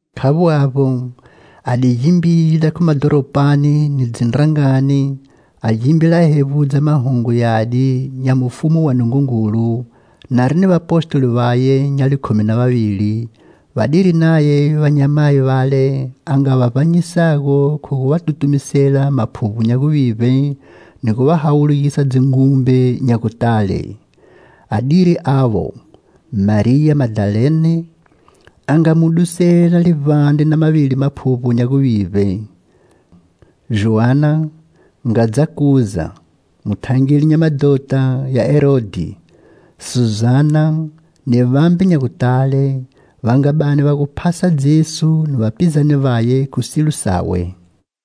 Khavbo avbo, a di gimbila khu madhoropani ni dzindrangani, a gimbila a hevbudza Mahungu yadi nya mufumu wa Nungungulu, nari ni vapostoli vaye nya likhumi na vavili, vadiri naye vanyamayi vale a nga va vbanyisago khu gu va tutumisela maphuvbo nya guvivbe ni gu va hawulugisa dzingumbe nya gutale. Adiri avo: Mariya Madalene, a nga mu dusela livbandre na mavili maphuvbo nya guvivbe, Joana, ngadza Kuza, muthangeli nya madhota ya Herodhi; Suzana, ni vambe nya gutale, va nga bani va gu phasa Jesu ni vapizane vaye khu silo sawe.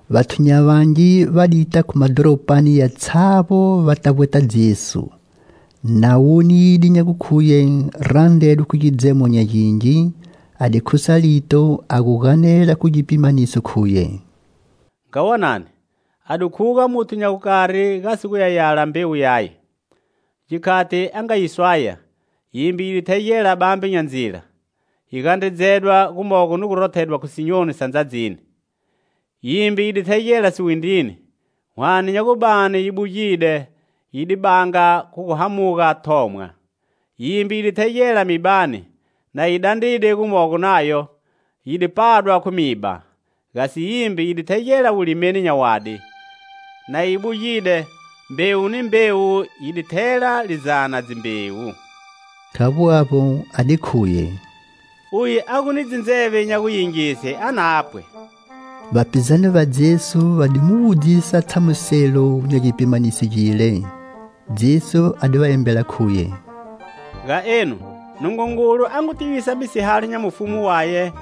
Vathu nya vangi va dita khu madhoropani yatshavbo va ta vbweta Jesu. Na wonide nya gukhuye randredwe khu gidzemo nya gingi, a di khusa lito, a gu ganela khu gipimaniso, khuye: "Nga wonani. A di khuga muthu nya gukari gasi guya yala mbewu yaye. Gikhati a nga yi swaya, yimbe yi di thegela bambe nya ndzila; yi gandredzedwa, gumogo ni gu rothedwa khu sinyoni sa ndzadzini. Yimbe yi di thegela siwindrini; hwane nya gu bani yi bugide, yi di banga khu gu hamuga thomwa. Yimbe yi di thegela mibani; na yi dandride gumogo nayo, yi di padwa khu miba. Gasi yimbe yi di thegela wulimeni nya wadi; na yi bugide, mbewu ni mbewu yidi thela lizana dzimbewu." Khavbo avbo, a di khuye: "Uye a gu ni dzindzeve nya guyingise, a na pwe!" Vapizane va Jesu va di mu wudzisa tshamuselo nya gipimaniso gile. Jesu a di va embela, khuye: "Ga enu, Nungungulu a ngu tivisa misihalo nya mufumu waye;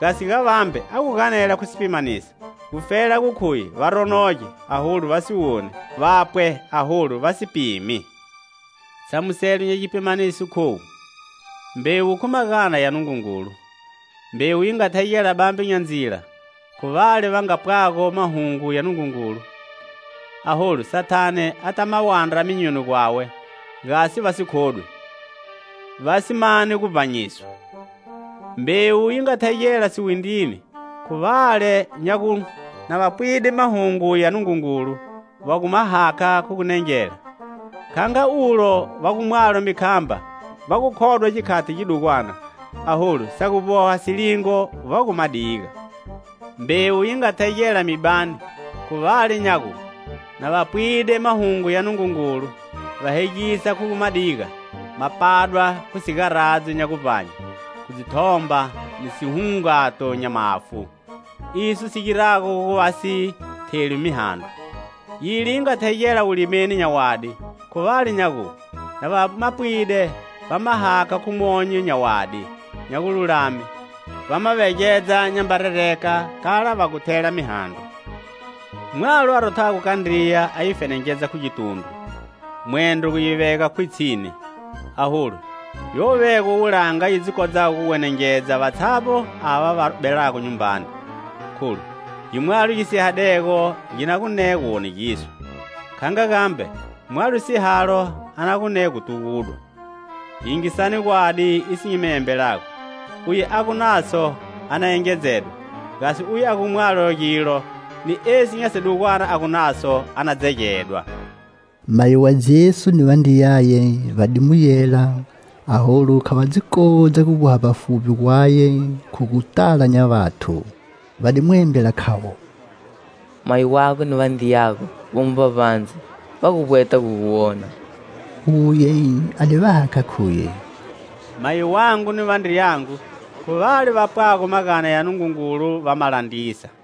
gasi ga vambe, a gu ganela khu sipimaniso, gufela gu khuye va ronoge, aholu vasi woni; vapwe aholu vasi si pimi. "Tshamuselo nya gipimaniso khowu: Mbewu khu magana ya Nungungulu. Mbewu yi nga thegela bambe nya ndzila khu vale va nga pwago Mahungu ya Nungungulu, aholu Sathane ata ma wandra myonyoni gwawe, gasi va si khodwi, vasi mani guvbanyiswa. Mbewu yi nga thegela siwindrini, khu vale nya gu, na va pwide Mahungu ya Nungungulu va gu ma hakha khu gunengela. Kha nga ulo va gu mwalo mikhamba, va gu khodwa gikhati gidugwana; aholu sa gu vboha silingo, va gu ma diga. Mbewu yi nga thegela mibani khu vale nya gu, na va pwide mahungo ya Nungungulu va hegisa khu gu ma diga ma padwa khu sigaradzo nya guvbanye, khu dzithomba ni sihungato nya mafu. Iso si girago gu va si theli mihandro. Yile yi nga thegela wulimeni nya wadi khu vale nya gu, na va ma pwide, va ma hakha khu monyo nya wadi nya gululame, va ma vegedza nyamba rereka kala va gu thela mihandro. "Mwalo a rothago kandriya a yi fenengedza khu gitundru, mwendro gu yi vega khwitshini. Aholu yo vegwa wulanga yi dzi kodzago gu wenengedza vatshavbo ava va belago nyumbani. Kholu, gimwalo gi sihadego gi na gu ne guwonegiswa; kha nga gambe, mwalo sihalo a na gu ne gu tugudwa. Yingisani gwadi iso nyi mi embelago: uye a gu naso a na engedzedwa; gasi uye a gu mwalo gilo, ni esi nya sidugwana a gu naso, a na dzegedwa." Mayi wa Jesu ni vandriyaye va di mu yela, aholu kha va dzi kodza guvboha vbafuvbi gwaye khu gu tala nya vathu. Va di mu embela, khavo: "Mayi wago ni vandriyago vomo vbavbandze; va gu vbweta gu gu wona." Uye a di va hakha, khuye: "Mayi wangu ni vandriyangu khu vale va pwago magana ya Nungungulu, va ma landrisa."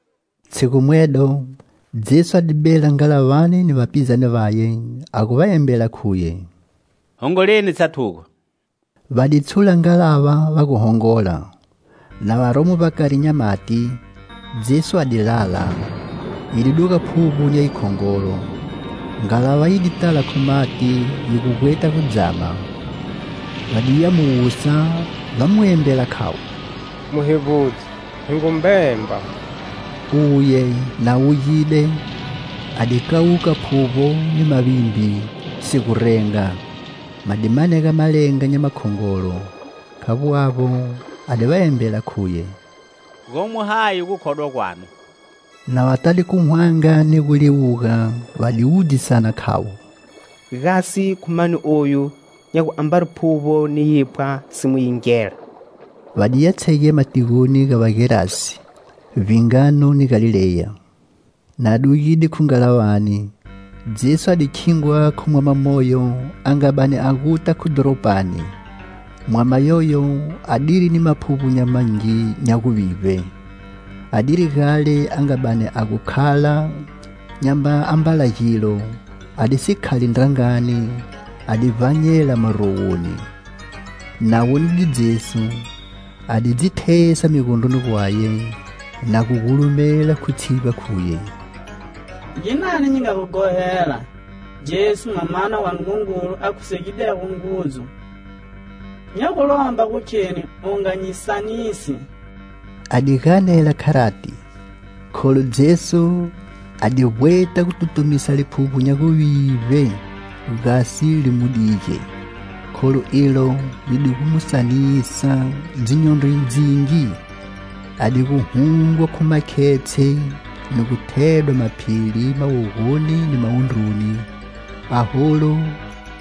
Tshigu mwedo, Jesu a di bela ngalavani ni vapizane vaye, a gu va embela, khuye: "Hongoleni tshatugo." Va di tshula ngalava va gu hongola. Na varomo vbakari nya mati, Jesu a di lala. Yi di duga phuvbo nya yikhongolo; ngalava yi di tala khu mati, yi gu vbweta gu dzama. Va diya mu wusa, va Mu embela, khavo: "Muhevbudzi, hi ngu mbemba!" Uye, na wugide, a di kawuka phuvbo ni mavimbi, si gu renga; ma di manega malenga nya makhongolo. Khavbo avbo, a di va embela, khuye: "Gomo hayi gukhodwa gwanu?" Na va tade khu hwanga ni guliwuga, va di wudzisana, khavo: "Gasi khu mani oyu nya gu ambari phuvbo ni yiphwa si mu yingela?" Va diya tshegema tigoni ga Vagerazi, vbingano ni Galileya. Na dugide khu ngalavani, Jesu a di khingwa khu mwama moyo a nga bani a guta khu dhoropani. Mwama yoyo adiri ni maphuvbo nya mangi nya guvivbe. Adiri gale a nga bani a gu khala nyamba ambala gilo a di si khali ndrangani, a di vbanyela marowoni. Na wonide Jesu, a di dzi thesa migondroni gwaye, na gu gulumela khu tshivba khuye: "Ginani nyi nga gu ghohela, Jesu, Mwamana wa Nungungulu a khusegidego ngudzu? Nya gu lomba gu kheni u nga nyi sanisi." A di ganela kharati, kholu Jesu a di vbweta gu tutumisa liphuvbo nya guvivbe gasi li mu dige; kholu ilo li di gu mu sanisa dzinyondro dzingi. A digu hungwa khu makhetshe ni gu thedwa maphili mawogo ni mawundru, aholu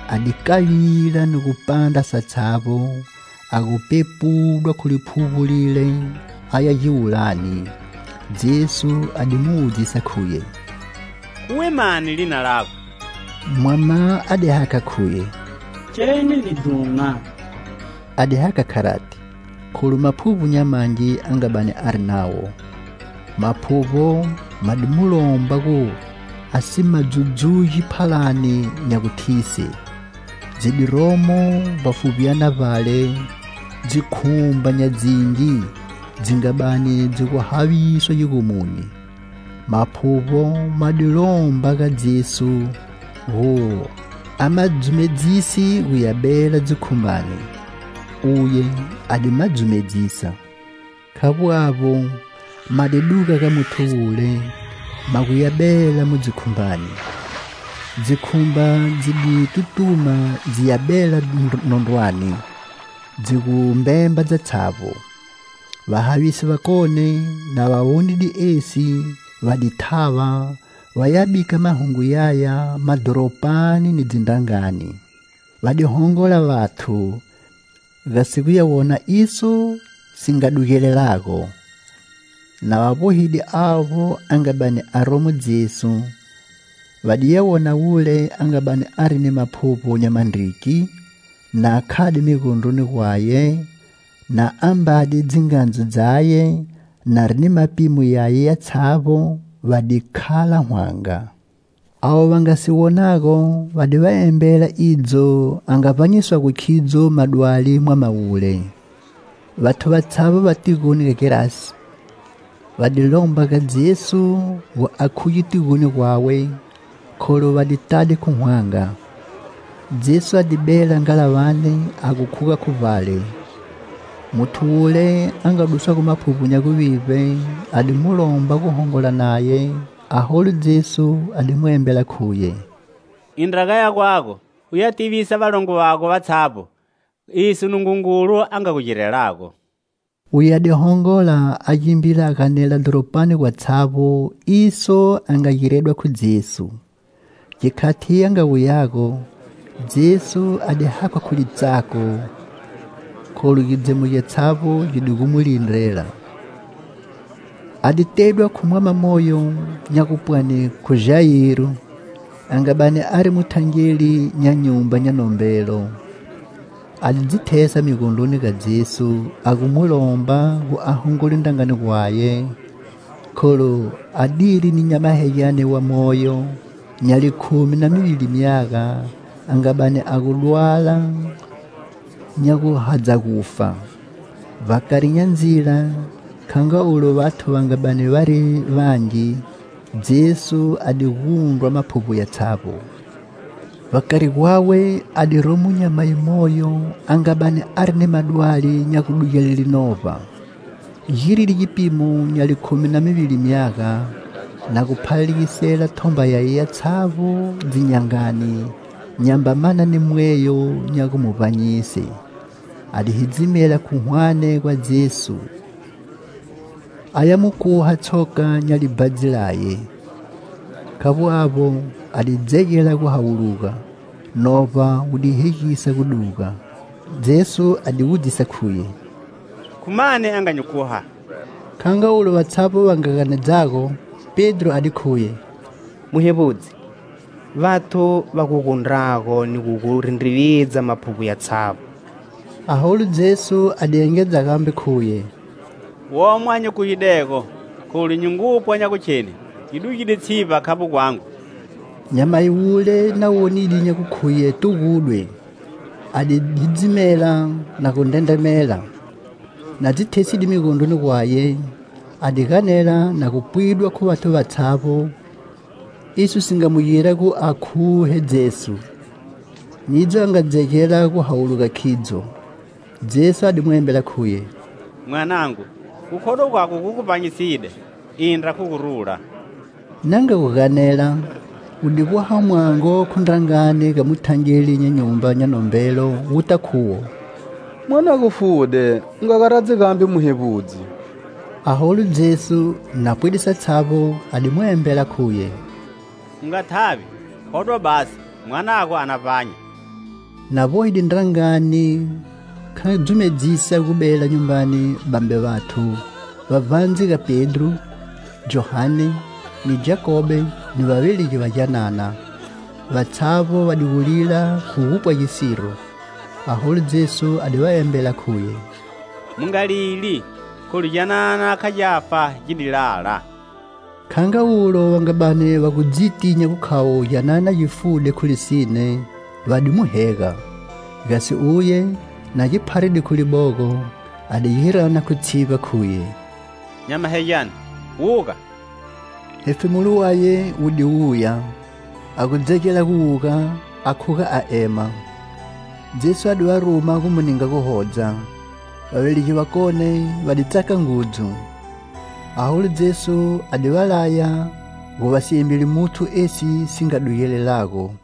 a di kavila ni gu pandra satshavbo, a gu pepudwa khu liphuvbo lile aya giwulani. Jesu a di mu wudzisa, khuye: "Khuwe mani, lina lago?" Mwama a di hakha, khuye: "Kheni lidhuma." A di hakha kharati, kholu maphuvbo nya mangi a nga bani ari nawo. Maphuvbo ma di mu lomba gu a si ma dzudzugi phalani nya guthise. Dzi di romo vbafuvbyana vbale dzikhumba nya dzingi dzi nga bani dzi gu haviswa gigomoni. Maphuvbo ma di lomba ga Jesu gu a ma dzumedzise guya bela dzikhumbani. Uye a di ma dzumedzisa. Khavbo avbo, ma di duga ga muthu wule, ma gu ya bela mu dzikhumbani. Dzikhumba dzi di tutuma dziya bela nondrwani, dzi gu mbemba dzatshavbo. Vahavisi vakone, na va wonide esi, va di thava, vaya bika mahungu yaya madhoropani ni dzindrangani. Va di hongola vathu, gasi guya wona iso si nga si dugelelago. Na va vbohide avbo a nga bani aromo Jesu, va diya wona wule a nga bani ari ni maphuvbo nya mandriki, na khade migondroni gwaye, na ambade dzingandzu dzaye, nari ni mapimo yaye yatshavbo, va di khala hwanga. Avo va nga si wonago va di va embela idzo a nga vbanyiswago khidzo madwali mwama wule. Vathu vatshavbo va tigoni ga Gerazi, va di lomba ga Jesu gu a khuge tigoni gwawe, kholu va di tade khu hwanga. Jesu a di bela ngalavani a gu khuga khu vbale. Muthu wule a nga duswago maphuvbo nya guvivbe a di mu lomba gu hongola naye, aholu Jesu a di mu embela, khuye: "Indra gaya gwago uya tivisa valongo vatshavbo iso Nungungulu a nga gu girelago." Uye a di hongola a gimbila a ganela dhoropani gwatshavbo iso a nga giredwa khu Jesu. Gikhati a nga wuyago, Jesu a di hakhwa khu litsako, kholu gidzemo gyatshavbo gi di gu mu lindrela. A di tedwa khu mwama moyo nya gupwani khu Jayiro, a nga bani ari muthangeli nya nyumba nya nombelo. A di dzi thesa migondroni ga Jesu a gu mu lomba gu a hongole ndrangani gwaye, kholu adiri ni nyamahegyane wa moyo, nya likhumi na mivili myaga, a nga bani a gu dwala nya gu hadza gufa. Vbakari nya ndzila, kha nga olu vathu va nga bani vari vangi, Jesu a di gundrwa maphuvbo yatshavbo. Vbakari gwawe a di romo nyamayi moyo a nga bani ari ni madwali nya gudugele novba. Giride gipimo nya likhumi na mivili myaga, na gu phalalegisela thomba yaye yatshavbo dzin'yangani, nyamba mana ni mweyo nya gu mu vbanyise. A di hidzimela khu hwane gwa Jesu, aya mu khuha tshoka nya libhadzi laye. Khavbo avbo, a di dzegela gu hawuluga, novba wu gu hegisa gu duga. Jesu a di wudzisa, khuye: "Khu mani a nga nyi khuha?" Kha nga ulo vatshavbo va nga ganedzago. Pedro a di khuye: "Muhevbudzi, vathu va gu gundrago ni gu gu rindrividza maphuvbo yatshavbo." Aholu Jesu a di engedza gambe, khuye: "Womo a nyi khuhidego, kholu nyi ngupwa nya gukheni yi dugide tshivba khavbo gwangu." Nyamayi wule na wonide nya gukhuye tugudwe, a di hidzimela, na gu ndrendremela. Na dzi theside migondroni gwaye, a di ganela na gu pwidwa khu vathu vatshavbo, iso si nga mu gira gu a khuhe Jesu, nidzo a nga dzegela gu hawuluga khidzo. Jesu a di mu embela, khuye: "Mwanangu, gukhodwa gwago gu gu vbanyiside; indra khu gurula." Na nga gu ganela, wu di vboha mwango khu ndrangani ga muthangeli nya nyumba nya nombelo, wuta khuwo: "Mwanago fude; u nga garadzi gambe Muhevbudzi." Aholu Jesu, na pwide satshavbo, a di mu embela, khuye: "U nga thavi, khodwa basi; mwanago a na vbanya." Na vbohide ndrangani kha dzumedzisa gu bela nyumbani vambe vathu, vbavbandze ga Pedro, Johane ni Jakobe, ni vavelegi va gyanana. Vatshavbo va di gu lila khu gupwa gisiro. Aholu Jesu a di va embela, khuye: "Mu nga lili, kholu gyanana kha gyafa, gi di lala." Kha nga ulo va nga bani va gu dziti nya gukhavo gyanana gi fude khu lisine, va di mu hega. Gasi uye, na gi pharide khu libogo, a di gi rana khu tshivba, khuye: "Nyamahegyane, wuga." Hefemulo waye wu di wuya, a gu dzegela gu wuga, a khuga a ema. Jesu a di va ruma gu mu ninga guhodza. Vavelegi vakone va di tsaka ngudzu. Aholu Jesu a di va laya gu va si embeli muthu esi si nga dugelelago.